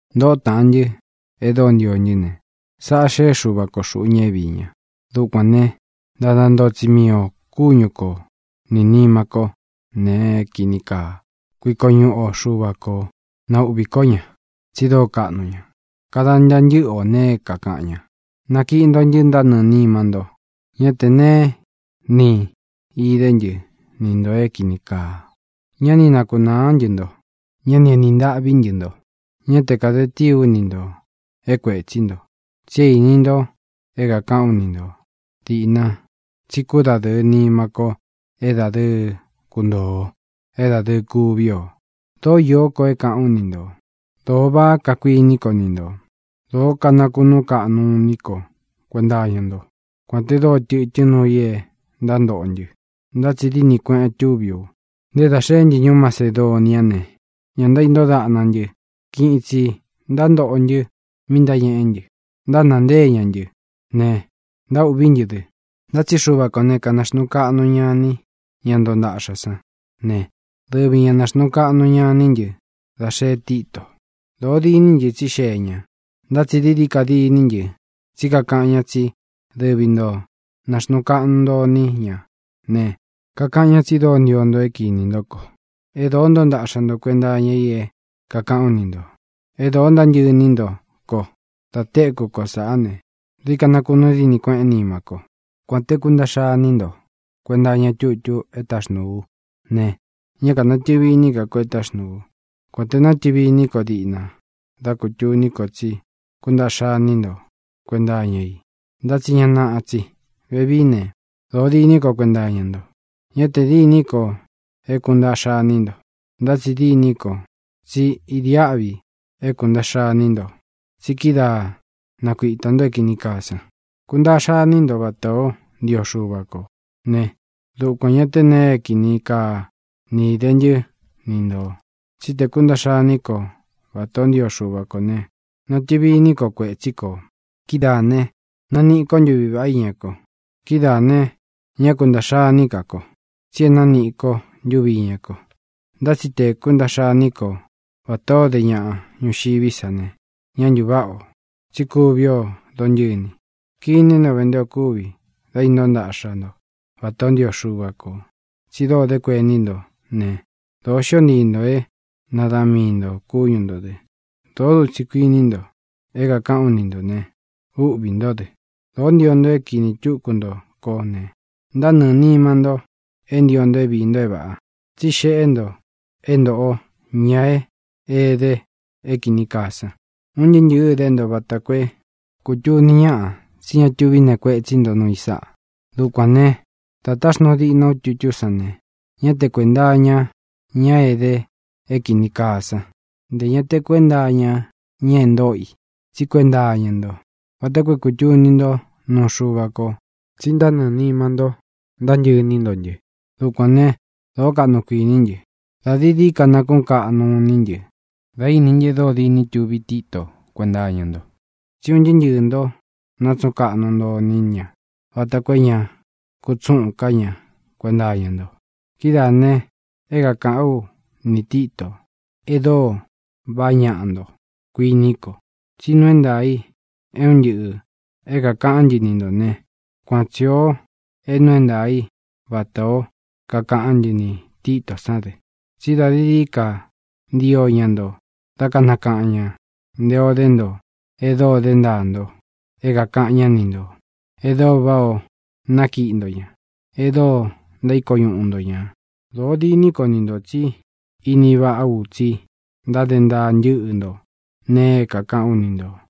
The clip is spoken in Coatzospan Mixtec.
Ntōꞌó taꞌan ntɨ́ e dóo ntio ntɨ́ ne, sáꞌā xeꞌé Xuva ko xūꞌu ña é viī ña. Dukuān ne, ntada ntoo tsi mii ō kúñu ko ni nīma ko nee é kīni kaa. Kuiko ñuꞌu o Xuva kō, na ūꞌvi ko ña, tsi dóo kaꞌnu ña. Kada ntaa ntɨ́ꞌɨ ō nee é kākaꞌan ña. Nakiꞌi nto ntɨ ntánɨɨ̄ nima nto. Ñá tē neé ni īde ntɨ́ ni ntō é kīni kaa. Ñá ni nakunāá ntɨ nto. Ñá ni enī ntâꞌví ntɨ nto. Ñá te kāde tíi ú ni ntō é kuetsí nto. Tsi é īni nto é kākaꞌán u ni nto dīꞌna tsí kudadɨɨ nima ko é dadɨɨ kuntoo ō, é dadɨɨ kuví ō. Dōó īó ko é kāꞌán u ni ntō. Dōo váꞌa kakuiní ko ni ntō. Dōó kanakunuu kaꞌnu iní ko kuenta iña nto. Kuān te dóo tɨtɨ́n nuu i e ntántoꞌo ntɨ, ntá tsi dínī kueꞌen túvi u. Nté dā xeé ntɨ ñuú Macedonia ne, ñá ntaíntóo daꞌna ntɨ; kiꞌin itsī ntántoꞌo ntɨ mi ntáñeꞌé ntɨ: ntánāa ntée ña ntɨ́ ne, ntaúꞌví ntɨ dɨ. Ntá tsi Xuva kō ne, kanaxnuu kaꞌnu ña iní ña ntoo ntaꞌxa san ne, dɨvi ñā náxnuu kaꞌnu ña iní ntɨ dá xee Títo. Dōo diní ntɨ tsí xee ña, ntá tsi dií dií ka diní ntɨ tsí kakaꞌan ña tsí dɨvi ntō náxnuu kaꞌnu nto iní ña ne, kakaꞌan ñá tsi dóo ntio nto é kinī ntó ko, e dóo ntoo ntaꞌxa nto kuenta iña i é kākaꞌán u ni ntō, e dóo ntántɨꞌɨ iní nto ko. Dā tékū ko sáꞌā ne, dií ka nakunuu dínī kueꞌén nimá ko. Kuān te kúntaꞌxa iní nto kuenta iña tutu e táxnūu ú ne, ñá kānatɨvi iní ka ko é taxnūu ú, kuān te nátɨvi iní ko diꞌna dá kūtuní ko tsi kúntaꞌxa iní nto kuenta iña i; ntá tsi ña naꞌa tsi. Vevií ne, dōo diní ko kuenta iña nto. Ñá tē dîní ko é kūntaꞌxa iní nto, ntá tsi dîní ko tsí idiáꞌvi é kūntaꞌxa iní nto, tsi kídaā nakuíta nto é kīni kaa san. Kūntaꞌxa iní nto vatā ó ntio Xuva ko ne, dukuān ñá tē nee é kini kaa ni īde ntɨ́ ni ntō. Tsí te kūntaꞌxa iní ko vatā ó ntio Xuva kō ne, natɨvi iní ko kuetsí kō; kidáā ne, naniꞌi ko ntuví vaꞌá iña ko. Kidáā ne, ñá kuntaꞌxa iní ka kō, tsi e nániꞌi ko ntuvi iña ko. Ntá tsi te kūntaꞌxa iní ko vatā ó de ñaꞌa ñuxiví sa ne, ñá ntūváꞌa ō, tsí kuvi o dóntɨ́ni. ¡Kiní nto ve nté ō kúvi da intóo ntaꞌxa nto vatā o ntío Xuva kō! tsi dóo dé kuení nto ne, dōo xió ntii nto é nadaꞌan mii nto kúñu ntō dɨ. Dōó dutsi kuíni nto é kākaꞌán u ni ntō ne, úꞌvī ntó dɨ. Dōó ntio nto é kinī túku nto kó ne, ntánɨɨ̄ nima nto é ntio nto é viī nto é vāꞌa, tsí xeꞌé nto é ntōꞌo ña é ede é kīni kaa san. Un ntɨɨ́ ntɨ̄ɨ́ dé nto vata koo é kūtuni ñáꞌa tsí ña tuví nee kuetsí nto nuu i sáꞌa. Dukuān né, dā táxnūu diꞌna ú tutú san ne, ñá te kuēnta iña ña é ede é kīni kaa sán, ntē ña te kuénta iña ña e ntóꞌo i, tsí kuenta iña ntó, vata koo é kūtuni ntó nuu Xuva ko tsi ntánɨɨ̄ nima nto ntántɨꞌɨ iní nto ntɨ. Dukuān né, dōó kaꞌnu kuiní ntɨ. Dā dií dií ka nakúꞌun kaꞌnu iní ntɨ da íni ntɨ́ e dóo diní tuvi Títo kuenta iña nto. Tsí un ntɨɨ́ ntɨɨ̄ nto nátsuꞌun kaꞌnu nto iní ña vata koo é ña kutsúꞌun ká ña kuenta iña nto. Kidáā ne, é kākaꞌán u nī Tito e dóo vaꞌá ñaꞌa nto, kuiní ko. Tsí nuu é ntaā i é un ntɨꞌɨ̄ é kākaꞌán ntɨ ni ntō ne, kuan tsi ō é nuu é ntaā í vatā ó kakaꞌán ntɨ nī Titó san dɨ. Tsí dā dií dií ka ntío ña nto dá kanakaꞌan ñā nté ō dé nto e dóo dé ntaa nto é kākaꞌan ñá ni ntō, e dóo váꞌā o nákiꞌi nto ña, e dóo ntaíko ñuꞌu nto ñā. ¡Dōo diní ko ni ntō tsí ini váꞌa ú tsi ntáde ntaa ntɨ́ꞌɨ nto nēe é kākaꞌán u ni ntō!